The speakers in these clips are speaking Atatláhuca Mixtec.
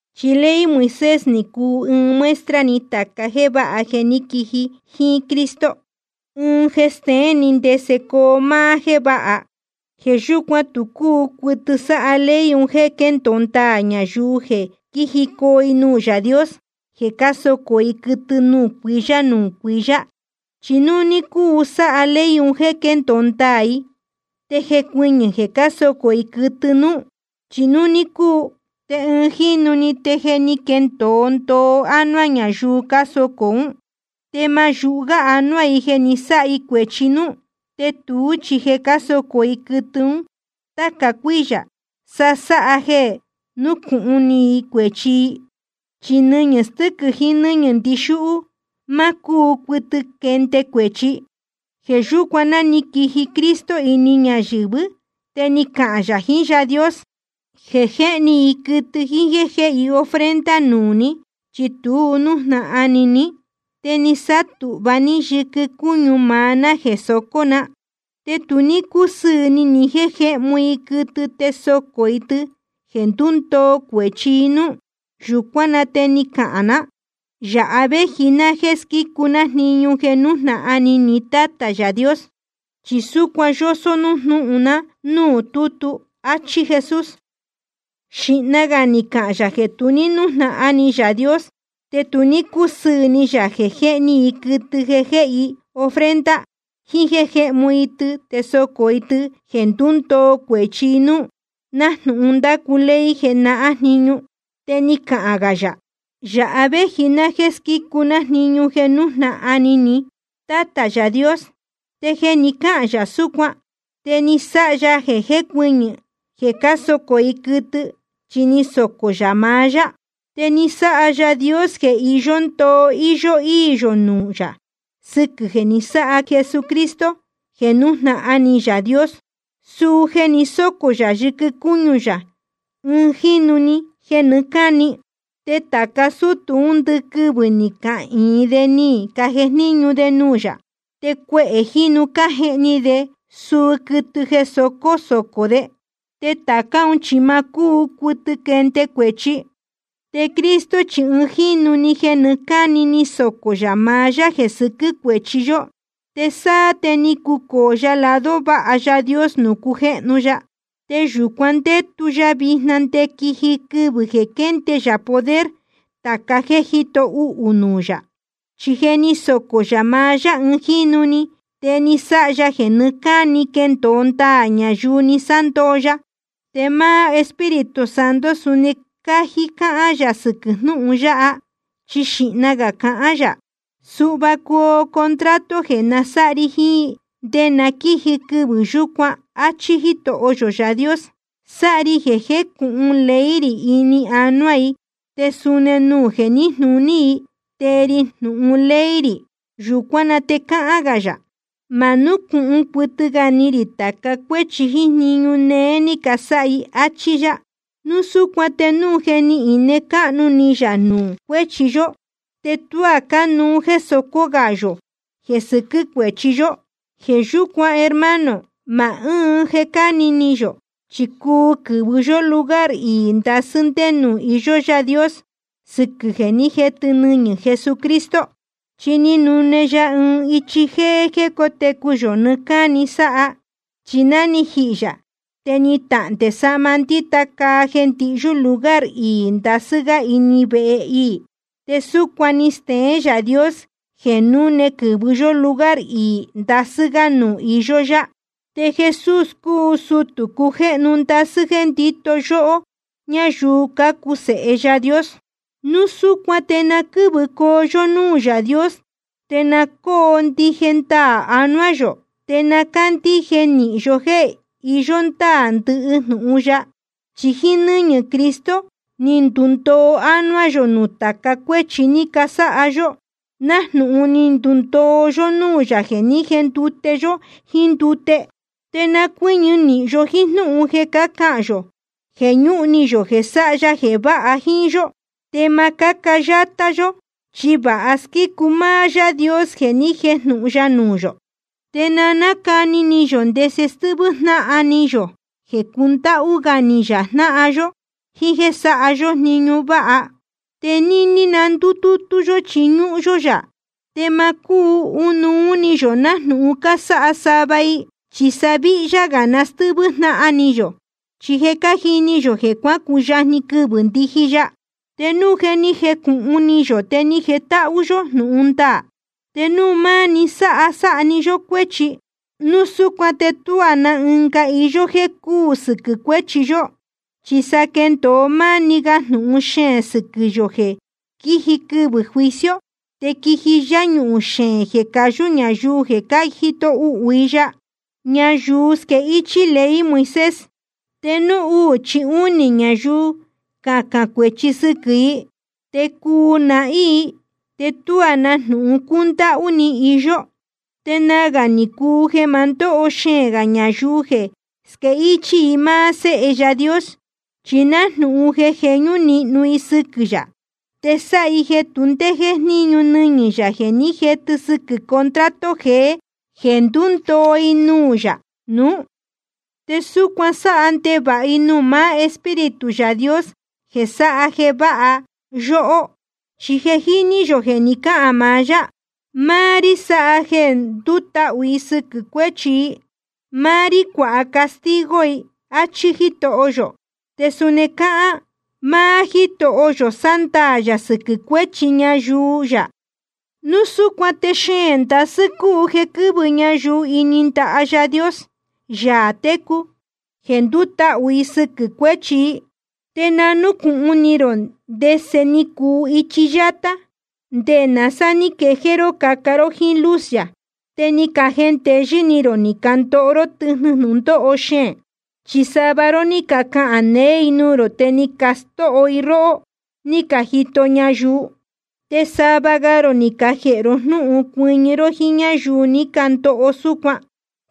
Chi ley Moisés ni cuu ɨɨn muestra‑ni tāca jéē váha jeē ní quiji jíín Cristo, ɨɨn jeē steén‑ni ndese coo máá jéē váha. Jeē yúcuan tu cúu cuɨtɨ sáha ley un jéē quéndōo ndaā ñayuu jeē quíjicoo i nuū Yaā Dios jeē cásocō i quɨtɨ nuū cuiyá nuū cuiyá. Chi núu ní cúu sáha ley un jéē quéndōo ndaā i, te jecuɨñɨ̄ jeē cásocō i quɨtɨ núú. Chi núu ní cúu, te ɨɨn jínu‑ni te je ni quendōo ndoo ánuá ñayuu cásocō ún, te ma yūhu gá anuá i jeē ni sáha i cuēchi núú. Te tuú chi jeē cásocō i quɨtɨ ún táca cuíyā, sa sáha jeē núcūhun ni i cuēchi i. Chi nɨñɨ̄ stɨ́quɨ̄ jiín nɨ́ñɨ̄ ndixúhú, ma cúu cuɨtɨ quende cuēchi. Jeē yúcuan ná ni quiji Cristo ini ñayɨ̄vɨ́, te ni cahān yā jiín Yaā Dios: Jeē jéhni i quɨtɨ jíín jéē jéhe i ofrenda nuū ní, chi tu ní nújnahan ni ní. Te ni sátūhva ní yɨquɨ cúñu maá ná jeē socó na. Te tu ní cúsɨɨ̄ ni ni jéē jéhmu i quɨtɨ te sócó i tɨ jeē ndúndoo cuēchi i núú. Yūcuán na te ni cahān ná: Yāha véji ná jéē squícu ná jniñu jeē nújnahan ni ní, Tátā Yaā Dios. Chi súcuan je yósó jnúhun na núū tútu. Achí Jesús. Xīhna gā ni cahān yā jeē tu ní nújnahan ni Yaā Dios te tu ní cúsɨɨ̄ ni yā jeē jéhni i quɨtɨ te jéhe i ofrenda, jiín jéē jéhmu i tɨ te sócó i tɨ jeē ndúndoo cuēchi i núú, nájnūhun ndácu ley jenahán jniñu. Te ni cahān gā yā: Yāha véji ná jéē squícu ná jniñu jeē nújnahan ni ní, Tátā Yaā Dios. Te jeē ni cáhān yā súcuan, te ni sáha ya jeē jécuɨñɨ̄ jeē cásocō i quɨtɨ, chi ni socō yā maá yá. Te ni sáha Yaā Dios jeē iyó ndoo íyó íī yō nuū yā sɨquɨ̄ jeē ni sáha Jesucristo jeē nújnahan ni Yaā Dios, suu jeē ni sócō yā yɨquɨ cúñu yā ɨɨn jínu‑ni jeē nɨɨ́ cáni. Te tāca sútū ún ndɨquɨvɨ̄ ni cahīin de ni cajejníñu de nuū yā, te cuehē jínu cájehni de suu quɨtɨ jeē socó socó de. Te tācá un chi ma cúu cuɨtɨ quende cuēchi. Te Cristo chi ɨɨn jínu‑ni jeē nɨɨ́ cáni ni socō yā maá yá jeē sɨquɨ́ cuéchi yó. Te sáá te ni cucōo ya lado váha Yaā Dios nuū cujéhnu ya. Te yūcuan ndétu ya vijna nde quiji quɨvɨ̄ jeē quénde yā poder tāca jéē jíto uhū nuū yā. Chi jeē ni sócō yā maá yá ɨɨn jínu‑ni, te ni sáha ya jeē nɨɨ́ cáni quendōo ndaā ñayuu ni sándoo ya. Te máá Espíritu Santo suni cájí cáhán yā sɨquɨ̄ jnúhun yáha, chi xīhna gā cahán yā: Suhva coo contrato jeē nasáha ri jiín i, nde na quíji quɨvɨ̄ yúcuan, áchí Jítoho yō Yaā Dios: Sáha ri jeē jécūhun ley rī ini anuá i, te suni nuū jeē níjnūní i tee ri jnūhun ley rī. Yūcuán na te cáhán gā yā: Ma núcūhun cuɨtɨ gā ni rī tāca cuéchi jíín jniñu néé ní casáha i. Achí yá. Núu súcuan te núu je ni ine cáhnu ni yā nuū cuéchi yó, te tuá cánuú jéē socó gā yō jeē sɨquɨ́ cuéchi yó. Jeē yúcuan hermano, ma ɨ́ɨn jeē cáni ni yō, chi cuu quɨ̄vɨ yó lugar iī ndasɨ́ ndé nuū iyó Yaā Dios, sɨquɨ̄ jeē ní jetɨ nɨñɨ̄ Jesucristo. Chi ni nune ya ɨɨn ichi jéé jéē cótecu yō nɨɨ́ cáni sáha ya. Chi ná ni jihī yā te ni tahndē sahma ndíta caa jeē ndihyú lugar iī ndasɨ́ gá ini vehe iī. Te súcuan ni steén Yaā Dios jeē núne quɨ́vɨ yó lugar iī ndasɨ́ gá nuū iyó yá. Te Jesús cúu sutū cujéhnu ndasɨ́ jeē ndíto yóhó ñáyuu cácuu sēhe Yaā Dios. Núu súcuan te na quɨ́vɨcoo yó núū Yaā Dios, te na cóo ndije ndaā anuá yō, te na cándíje nīhin yó jéē iyó ndáā ndɨhɨ jnūhun ya. Chi jíín nɨ́ñɨ̄ Cristo ni ndundoo ánuá yō nuū tāca cuéchi ni casáha yó, nájnūhun ni ndundoo yó núū yā jeē ní jendute yó jíín ndute. Te na cuɨ́ñɨ nīhin yó jíín jnúhun jeē cácahān yō jeē ñúhun ni yō jeē sáha ya jeē váha jíín yó. Te ma cáca yátá yó, chi vāha squícu máá Yaā Dios jeē ni jéjnūhun ya nuū yō. Te na nácani ni yō ndese stɨ́hvɨ́ jnáhan ni yō jeē cundáhú gá ni yō jnáhan yó, jíín jéē sáha yó jniñu váha. Te níní na ndútútú yó chiñúhún yó yā, te ma cúhuun ni yō nájnūhun cásáha sava i, chi sa víhyá gā na stɨ́hvɨ́ jnáhan ni yō, chi je cájini yō jeē cuácuyajni quɨvɨ̄ ndíji ya. Te núu je ni jecūhun ni yō te ni jetáhú yó jnūhun ndaā, te núu máni sáha sáha‑ni yó cuéchi, núu súcuan te tuá na ɨnga iyó jéē cúū sɨquɨ̄ cuéchi yó. Chi sa quéndōo máni ga jnūhun xeēn sɨquɨ̄ yō jeē quiji quɨvɨ̄ juicio te quiji yáñuhūn xeēn jeē cayū ñayuu jeē cájito uhū i ya. Ñayuu squéhichī ley Moisés, te núu uū chí únī ñayuu cahán cuēchi sɨquɨ̄ i, te cuu nahín i, te tuá na jnūhun cúndáhú ni iyó. Te nagā ni cuu jeē ma ndóho xeēn gā ñayuu jeē squéhichī i máá Séhe Yaā Dios, chi nájnūhun jeē jeñú níhnu i sɨquɨ̄ yā. Te sáha i jeē tu ndé jéjníñu nɨñɨ̄ yā jeē ní jetɨ sɨquɨ̄ contrato jeē ndúndoo i nuū yā nuú. Te súcuan sáha ndevāha i nuū maá Espíritu Yaā Dios jeē sáha jeē váha yóhó. Chi je jíní yō jeē ni cáhān maá yá: Máá rí sáha jeē ndutahū i sɨquɨ̄ cuéchi i, máá rí cuāha castigo i, áchí Jítoho yō. Te suni cáhán: Máá Jítoho yō sándaā yā sɨquɨ̄ cuéchi ñayuu yā. Núu súcuan te xeēn ndasɨ́ cúu jeē quɨ́vɨ ñayuu ini ndaha Yaā Dios, Yaā técu, jeē ndútahū i sɨquɨ̄ cuéchi i. Te na núcūhun ni rō ndese ni cuu ichi yátá, nde náa sá ní quejéé ró caca ró jíín luz yā, te ni cajendeyɨ́ ni rō ni candoho ró tɨjnɨ jnūndóho xeēn. Chi sava ró ní cacahān neé i nuū rō te ni castóho i róhó ní cajito ñayuu. Te sava ga rō ni cajēhe ró jnúhun cuɨñɨ ró jíín ñáyuu ni candoho súcuan.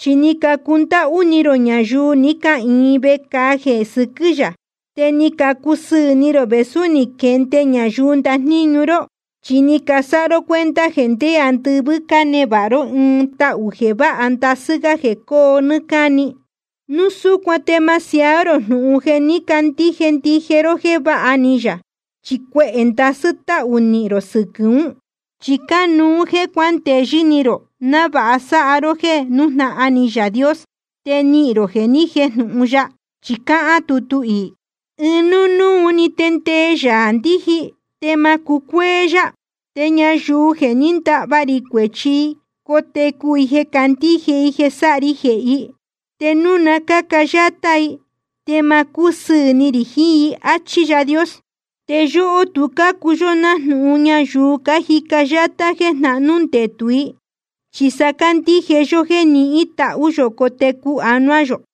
Chi ni cacundáhú ni rō ñayuu ní cahīin vecāa jeē sɨquɨ́ yā, te ni cacusɨɨ̄ ni rō vēsú ni caquende ñayuu ndajníñu ró. Chi ni casáha ró cuenta jeē ndé andɨvɨ́ cánevāha ró ɨɨn tahū jeē váha ndasɨ́ gá jeē coo nɨ́ɨ́ cáni. Núu súcuan te ma siaá rō jnūhun jeē ní candíje ndije ró jéē váha ni yā, chi cuehē ndasɨ́ táhū nihīn rō sɨquɨ̄ ún. Chi cánuú jéē cuándeyɨ́ ni rō návāha sáha ró jéē nújnahan ni Yaā Dios, te nihīn rō jeē ni jéjnūhun ya. Chi cáhán tutu iī: Ɨɨn núnúu‑ni te ndee Yaā ndiji, te ma cucuéé yá. Te ñayuu jeē ní ndahva rī cuēchi i, cotecu i jeē candíje i jeē sáha ri jehē i. Te núu na cáca yátá i, te ma cúsɨɨ̄ ni rī jiín i. Achí Yaā Dios. Te yóhó tu cácuu yó jnáhan ñayuu cájica yátá jeē jnahnú ndetū i. Chi sa cácandíje yó jéē nihín tahū yō cotecu anuá yō.